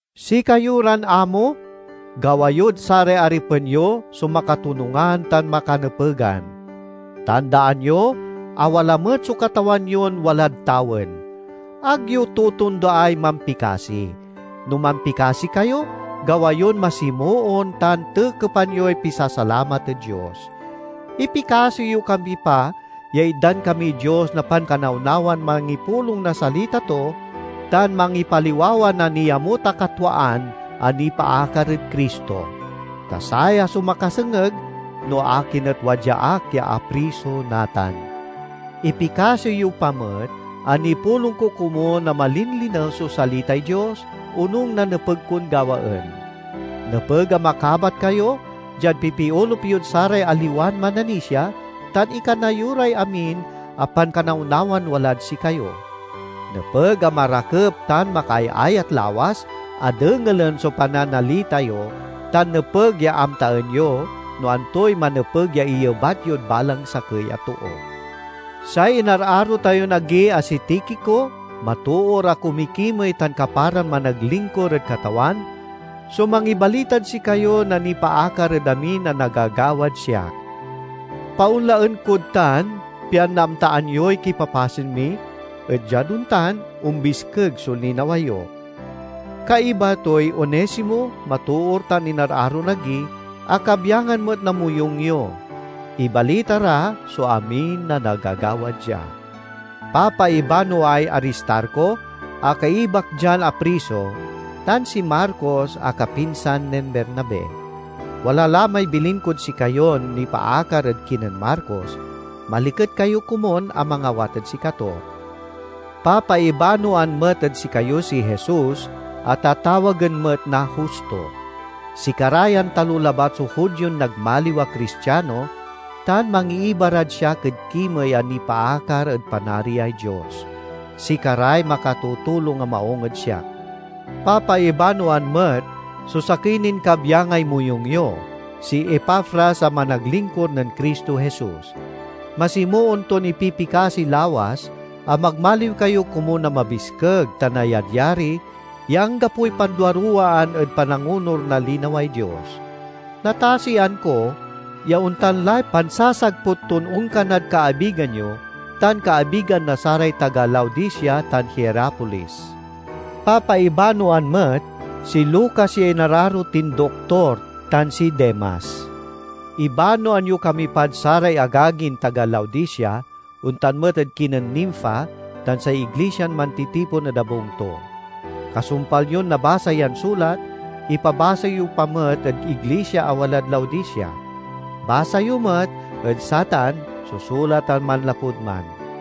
Sikayo ran amo, gawa yod saray aripen yo so makatonungan tan makanepegan. Tandaan yo a wala met so Katawan yon walad tawen. Ag yo totondaay mampikasi. No mampikasi kayo, gawa yon masimoon tan tekepan yoy pisasalamat ed Dios. Ipikasi yo kami pa ya itdan kamiy Dios na pankanawnawan mangipulong na salita to tan mangipaliwawa na niamut a katwaan a nipaakar ed Cristo. Ta saya so makasengeg no akin et wadya ak ya apriso natan. Ipikasi yo pa met a nipulong ko komun a malinlinew so salitay Dios, onung na nepeg kon gawaen. Nepeg a makabat kayo diad pipiolup yod saray aliwan mananisia, tan ikana yo ray amin a pankanawnawan walad sikayo. Nepeg a marakep tan makaayayat lawas a dengelen so pananalita yo, tan nepeg ya amtaen yo no antoy manepeg ya iyebat yod balang sakey a too. Say inararo tayon agi a si Tikico, matoor a kumikimey tan kaparan managlinkur ed Katawan, so mangibalitad sikayo na nipaakar ed amin a nagagawad siak. Paonlaen kod tan, pian naamtaan yoy kipapasen mi, et diad ontan, ombiskeg so linawa yo. Kaiba toy Onesimo, matoor tan inararon agi, a kabyangan met na moyung yo. Ibalita ra so amin a nagagawad dia. Papaibanoay Aristarco a kaibak dian apriso, tan si Marcos a kapinsan nen Bernabe. (Wala la may bilin kod sikayon nipaakar ed kinen Marcos—maliket kayo komun a mangawat ed sikato.) Papaibanoan met ed sikayo si Jesus a tatawagen met na Justo. Sikara yan talo labat so Judion nagmaliw a Cristiano tan mangiiba rad siak ed kimey a nipaakar ed Panariay Dios. Sikaray makatutulong a maung ed siak. Papaibanoan met so sakey nin kabyangay moyung yo, si Epafras a managlinkur nen Cristo Jesus. Masimoon ton ipipikasi lawas a magmaliw kayo komun a mabiskeg, tan ayadyari ya anggapoy panduaruwaan ed panangonur na linaway Dios. Natasian ko ya ontan lay pansasagput ton onkanad kaabigan yo, tan kaabigan na saray taga Laodicea tan Hierapolis. Papaibanoan met si Lucas ya inararo tin doktor tan si Demas. Ibanoan yo kami pad saray agagin taga Laodicea, ontan met ed kinen Nimfa tan say iglisian mantitipon ed abung to. Kasumpal yon nabasa yan sulat, ipabasa yo pa met ed iglisia a walad Laodicea. Basa yo met ed satan so sulat a manlapud man.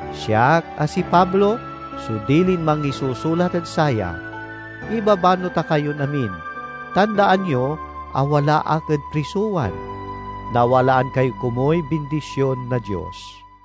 Siak, a si Pablo, so dilin mangisusulat ed saya: Ibabano ta kayon amin. Tandaan yo a wala ak ed prisowan! Nawalaan kayo komuy bindision na Dios.